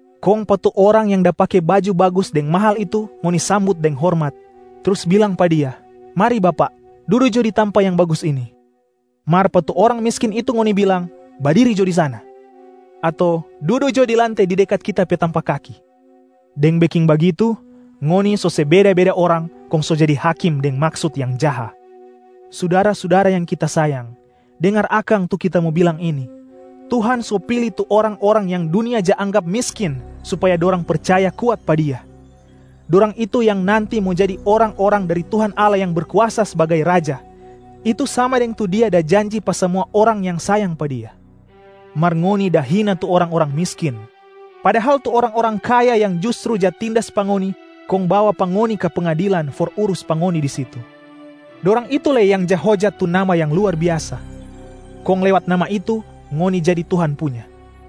Kong pa tu orang yang da pake baju bagus deng mahal itu ngoni sambut deng hormat, trus bilang pa dia, “Mari bapak, dudu jo di tampa yang bagus ini!” Mar pa tu orang miskin itu ngoni bilang, “Badiri jo di sana!” ato “Dudu jo di lante di dekat kita pe tampa kaki!” Deng beking bagitu, ngoni so se beda-beda orang kong so jadi hakim deng maksut yang jaha. Sudara-sudara yang kita sayang, dengar akang tu kita mo bilang ini: Tuhan so pili tu orang-orang yang dunia ja anggap miskin supaya dorang percaya kuat pa Dia. Dorang itu yang nanti mo jadi orang-orang dari Tuhan Allah yang Berkuasa sbagai Raja, itu sama deng tu Dia da janji pa samua orang yang sayang pa Dia. Mar ngoni da hina tu orang-orang miskin. Padahal tu orang-orang kaya yang justru ja tindas pa ngoni kong bawa pa ngoni ka pengadilan for urus pa ngoni di situ. Dorang itu lei yang ja hojat tu Nama yang luar biasa. Kong lewat Nama itu, ngoni jadi Tuhan punya.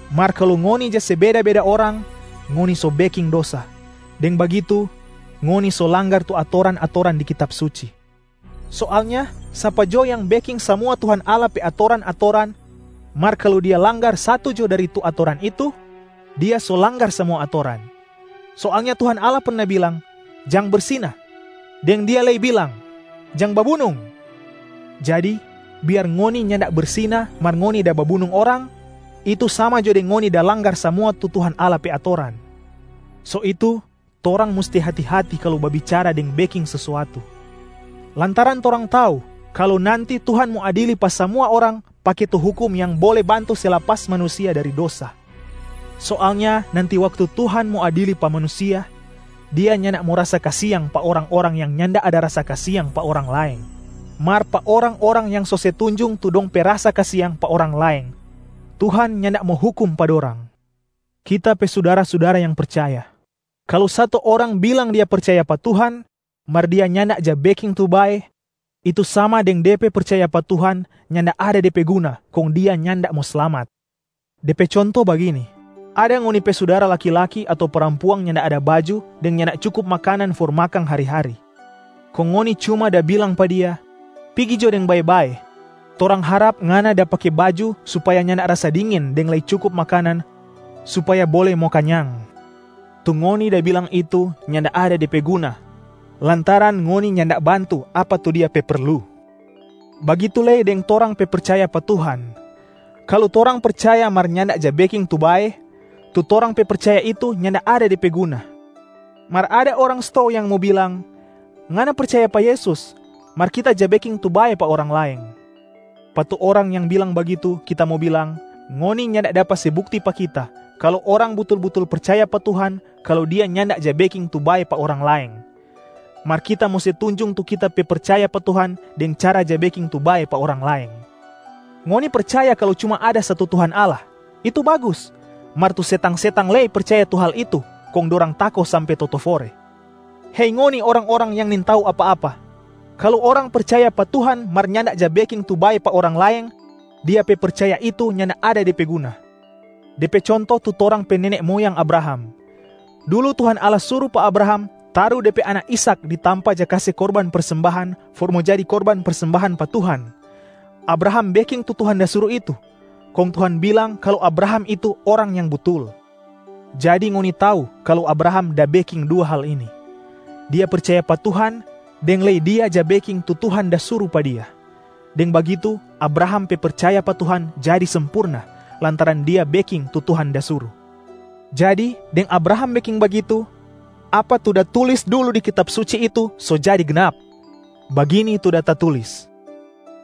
Mar kalu ngoni ja se beda-beda orang, ngoni so beking dosa. Deng bagitu ngoni so langgar tu atoran-atoran di Kitab Suci. Soalnya sapa jo yang beking samua Tuhan Allah pe atoran-atoran mar kalu dia langgar satu jo dari tu atoran itu, dia so langgar samua atoran. Soalnya Tuhan Allah perna bilang, “Jang bersina,” deng Dia lei bilang, “Jang babunung.” Jadi biar ngoni nyanda bersina mar ngoni da babunung orang, itu sama jo deng ngoni da langgar samua tu Tuhan Allah pe atoran. So itu torang musti hati-hati kalu babicara deng beking sesuatu, lantaran torang tau kalu nanti Tuhan mo adili pa samua orang pake tu hukum yang bole bantu se lapas manusia dari dosa. Soalnya nanti waktu Tuhan mo adili pa manusia, Dia nyanda mo rasa kasiang pa orang-orang yang nyanda ada rasa kasiang pa orang laeng. Mar pa orang-orang yang so se tunjung tu dong pe rasa kasiang pa orang laeng, Tuhan nyanda mo hukum pa dorang. Kita pe sudara-sudara yang percaya, kalu satu orang bilang dia percaya pa Tuhan, mar dia nyanda ja beking tu bae, itu sama deng de pe percaya pa Tuhan nyanda ada de pe guna kong dia nyanda mo slamat. De pe conto bagini: ada ngoni pe sudara laki-laki ato parampuang nyanda ada baju deng nyanda cukup makanan for mo makang hari-hari. Kong ngoni cuma da bilang pa dia, “Pigi jo deng bae-bae. Torang harap ngana da pake baju supaya nyanda rasa dingin deng lei cukup makanan supaya bole mo kanyang.” Tu ngoni da bilang itu nyanda ada de pe guna lantaran ngoni nyanda bantu apa tu dia pe perlu. Bagitu lei deng torang pe percaya pa Tuhan. Kalu torang percaya mar nyanda ja beking tu bae, tu torang pe percaya itu nyanda ada de pe guna. Mar ada orang stou yang mo bilang, “Ngana percaya pa Yesus, mar kita ja beking tu bae pa orang laeng.” Pa tu orang yang bilang bagitu, kita mo bilang, “Ngoni nyanda dapa se bukti pa kita kalu orang butul-butul percaya pa Tuhan kalu dia nyanda ja beking tu bae pa orang laeng. Mar kita mo se tunjung tu kita pe percaya pa Tuhan deng cara ja beking tu bae pa orang laeng.” Ngoni percaya kalu cuma ada satu Tuhan Allah. Itu bagus! Mar tu setang-setang lei percaya tu hal itu kong dorang tako sampe totofore. Hei ngoni orang-orang yang nintau apa-apa! Kalu orang percaya pa Tuhan mar nyanda ja beking tu bae pa orang laeng, dia pe percaya itu nyanda ada de pe guna. De pe conto tu torang pe nene moyang Abraham. Dulu Tuhan Allah suru pa Abraham taru de pe anak Ishak di tampa ja kase korban persembahan for mo jadi korban persembahan pa Tuhan. Abraham beking tu Tuhan da suru itu, kong Tuhan bilang kalu Abraham itu orang yang butul. Jadi ngoni tau kalu Abraham da beking dua hal ini: dia percaya pa Tuhan deng lei dia ja beking tu Tuhan da suru pa dia, deng bagitu Abraham pe percaya pa Tuhan jadi sempurna lantaran dia beking tu Tuhan da suru. Jadi deng Abraham beking bagitu, apa tu da tulis dulu di Kitab Suci itu so jadi gnap. Bagini tu da tatulis,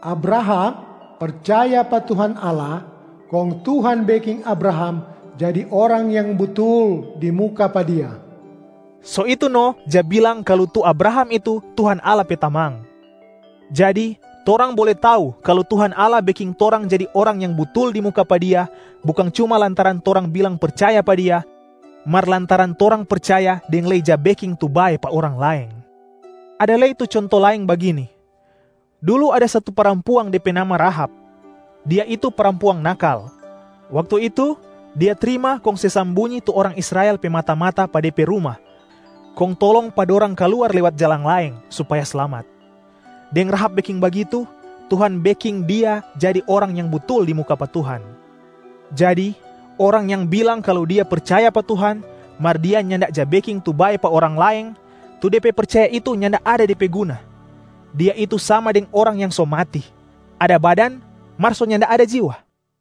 “Abraham percaya pa Tuhan Allah kong Tuhan beking Abraham jadi orang yang butul di muka pa Dia.” So itu no ja bilang kalu tu Abraham itu Tuhan Allah pe tamang. Jadi torang bole tau kalu Tuhan Allah beking torang jadi orang yang butul di muka pa Dia bukang cuma lantaran torang bilang percaya pa Dia, mar lantaran torang percaya deng lei ja beking tu bae pa orang laeng. Ada lei tu conto laeng bagini: dulu ada satu parampuang tu de pe nama Rahab. Dia itu parampuang nakal. Waktu itu, dia trima kong se sambunyi tu orang Israel pe mata-mata pa de pe ruma kong tolong pa dorang kaluar lewat jalang laeng supaya slamat. Deng Rahab beking bagitu, Tuhan beking dia jadi orang yang butul di muka pa Tuhan. Jadi orang yang bilang kalu dia percaya pa Tuhan, mar dia nyanda ja beking tu bae pa orang laeng, tu de pe percaya itu nyanda ada de pe guna. Dia itu sama deng orang yang so mati, ada badan mar so nyanda ada jiwa.